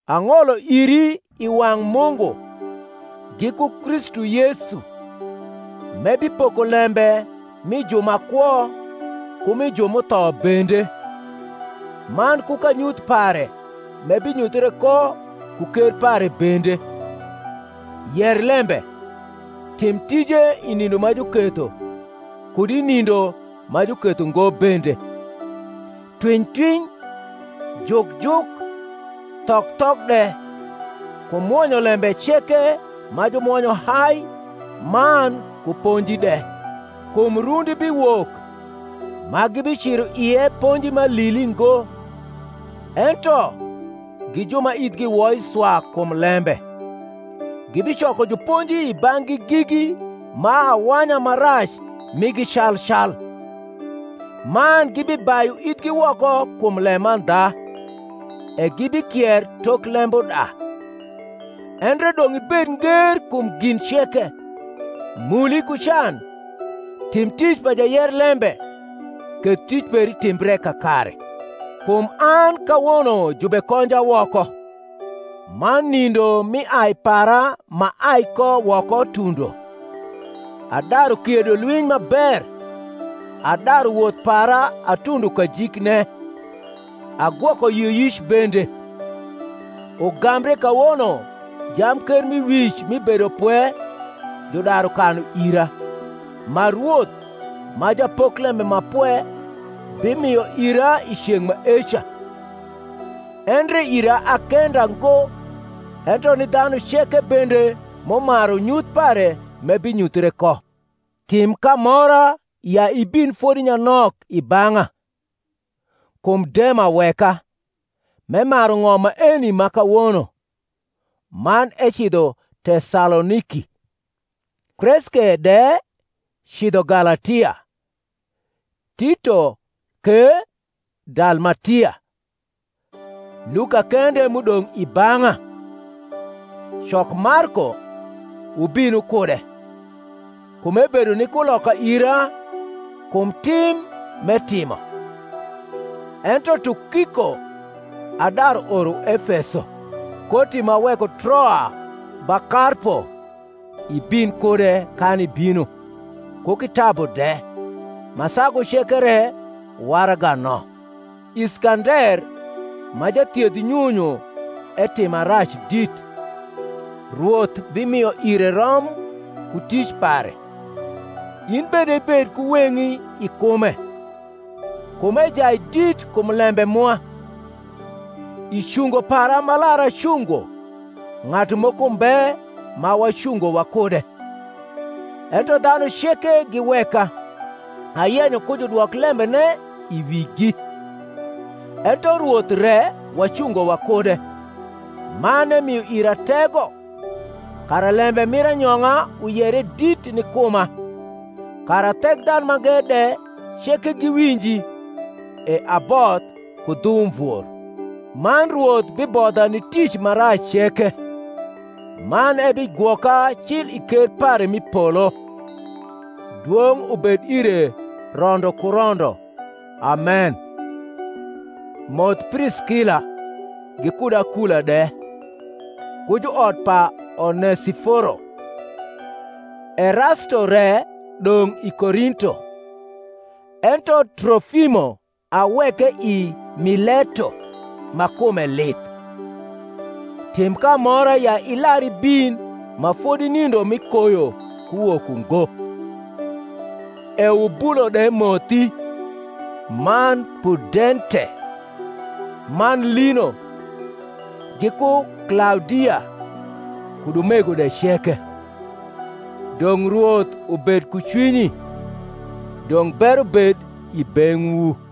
Ang’olo iri i wang’ Mungu, giku Kristu Yesu, m’ebipoko lembe mi ju ma kwo ku mi ju m’utho bende, man ku kanyuth pare m’ebinyuthre ko ku ker pare bende: yer lembe; tim tije i nindo ma juketho, kud i nindo ma juketho ngo bende; twiny twiny, juk juk, thok thok de, ku mwonyo lembe ceke ma jumwonyo hai man ku ponji de. Kum rundi biwok ma gibiciro ie ponji ma alili ngo; ento, gi ju ma ithgi woi swa kum lembe, gibicoko juponji i bang’gi gigi ma awanya ma rac migi cal cal; man gibibayu ithgi woko kum lemandha, e gibikier tok lembuda. Endre dong’ ibed nger kum gin ceke, muli ku can, tim tic pa jayer lembe, keth tic peri timbre kakare. Kum an kawono jubekonja woko, man nindo mi ai para m’aai ko woko tundo. Adaru kiedo lwiny ma ber, adaru wot.h para atundo kajikne, agwoko yioyic bende: ugambre kawono jamkermiwic mi bedopwe, judaru kanu ira, ma Rwoth, ma japoklembe ma pwe, bimio ira i ceng’ maeca; endre ira a kenda ngo, ento ni dhanu ceke bende m’umaru nyuth pare m’ebinyuthre ko. Tim k’amora ya ibin fodi nyanok i bang’a: kum Dema weka, m’emaru ng’om maeni ma kawono, man ecidho Tesaloniki; Kreske de cidho Galatia, Tito ke Dalmatia. Luka kende m’udong’ i bang’a. Cok Marko, wubin wukude; kum ebedo ni kuloka ira kum tim nr’etimo. Ento Tukiko adaru oro Efeso. Koti m’aweko Troa ba Karpo, ibin kude kan ibino, ku kitabu de, ma sagu ceke re waraga no. Iskander ma jathiedh nyunyu etima rac dit: Rwoth bimio ire rom ku tic pare: in bende ibed ku weng’i i kume; kum ejai dit kum lembe mwa. I cungo para m’alar acungo ng’atu moko mbe ma wacungo wakude, ento dhanu ceke giweka: ayenyo ku judwok lembene i wigi. Ento Rwoth re wacungo wakude, man emio ira tego; kara lembe mir anyong’a uyere dit ni kuma, kara Thekdhanumange de ceke giwinji: e aboth ku dhu umvor. Man Rwoth bibodha ni tic ma rac ceke, man ebigwoka cil i ker pare m’i polo: dwong’ ubed ire rondo ku rondo. Amen. Moth Priskila, gikud Akula de, ku juot pa Onesiforo. Erasto re dong’ i Korinto: ento Trohmo aweke i Mileto ma kume lith. Tim k’amora ya ilar ibin ma fodi nindo mi koyo kuwok ungo. Eubulo de mothi, man Pudente, man Lino, giku Klaudia, kud umego de ceke. Dong’ Rwoth ubed ku cwinyi. Dong’ bero bed i beng’wu.